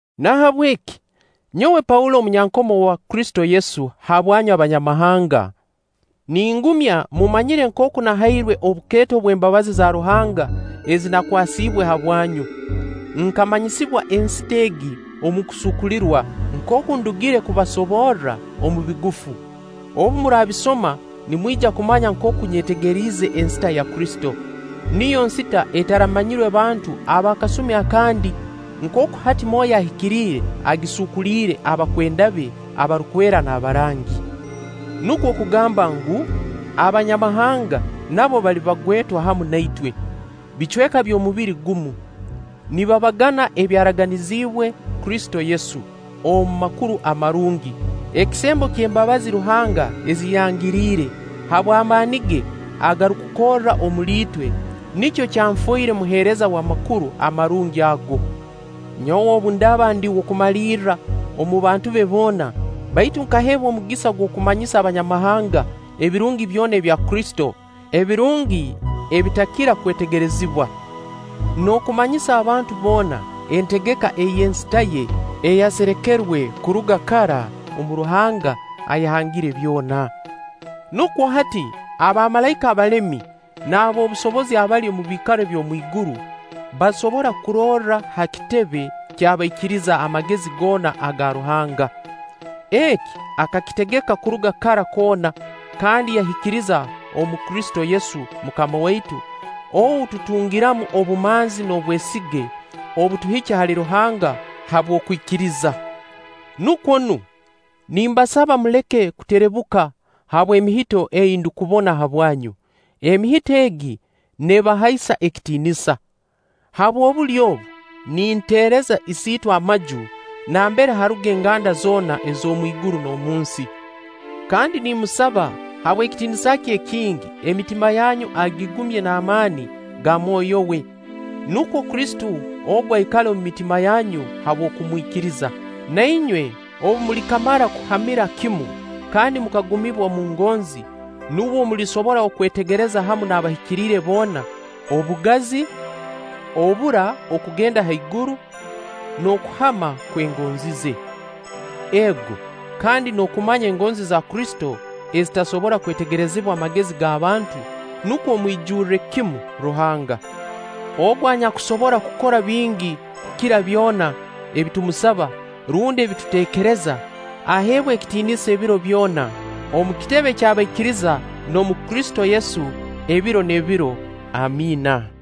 Nahabweki, nyowe Paulo omunyankomo wa Kristo Yesu habwanyu Abanyamahanga ningumya mumanyire nkooku nahairwe obukeeto bw'embabazi za Ruhanga ezi nakwasiibwe habwanyu. Nkamanyisibwa ensita egi omu kusuukulirwa, nkooku ndugire kubasoborra omu bigufu. Obu muraabisoma nimwija kumanya nkooku nyetegeriize ensita ya Kristo. Niyo nsita etaramanyirwe bantu ab'akasumi akandi, nkooku hati Mwoyo Ahikiriire agisuukuliire abakwenda be abarukwera n'abarangi. Nukwo kugamba ngu, Abanyamahanga nabo bali bagwetwa hamu na itwe, bicweka by'omubiri gumu, nibabagana ebyaraganiziibwe Kristo Yesu omu Makuru Amarungi, Ekisembo eky'embabazi Ruhanga ezi yangiriire, habw'amaani ge agarukukorra omuli itwe, nikyo kyanfoire muheereza w'Amakuru Amarungi ago. Nyowe obu ndaaba ndi w'okumalirra omu bantu be boona, baitu nkaheebwa omugisa ogw'okumanyisa Abanyamahanga ebirungi byona ebya Kristo, ebirungi ebitakira kwetegerezibwa. N'okumanyisa abantu boona entegeka ey'ensita ye eyaserekerwe kuruga kara omu Ruhanga, ayahangire byona. Nukwo hati abamalaika abalemi n'ab'obusobozi abali omu biikaro eby'omwiguru basobora kurorra ha kitebe ky'abaikiriza amagezi goona aga Ruhanga. Eki akakitegeka kuruga kara koona kandi yakihikiririza omu Kristo Yesu MUKAMA waitu, ou tutungiramu obumanzi n'obwesige obutuhikya hali Ruhanga habw'okwikiriza. Nukwo nu, nimbasaba muleke kuterebuka habw'emihito ei ndukubona habwanyu, emihito egi neebahaisa ekitiinisa. Habw'obulyo obu, ninteereza Isiitwe amaju nambere haruga enganda zoona ez'omwiguru n'omunsi, kandi nimmusaba habw'ekitiinisa kye ekingi emitima yanyu agigumye n'amaani ga Mwoyo we. Nukwo Kristo ogu aikale omu mitima yanyu habw'okumwikiriza Na inywe obu mulikamara kuhamira kimu kandi mukagumibwa omu ngonzi, nubwo mulisobora okwetegereza hamu n'abahikiriire boona: obugazi, obura okugenda ha iguru, n'okuhama kw'engonzi ze. Ego, kandi n'okumanya engonzi za Kristo ezitasobora kwetegerezibwa magezi g'abantu, nukwo mwijurre kimu Ruhanga. Ogu anyakusobora kukora bingi kukira byona ebi tumusaba rundi ebi tuteekereza, aheebwe ekitiinisa ebiro byona omu kitebe ky'abaikiriza n'omu Kristo Yesu, ebiro n'ebiro. Amiina.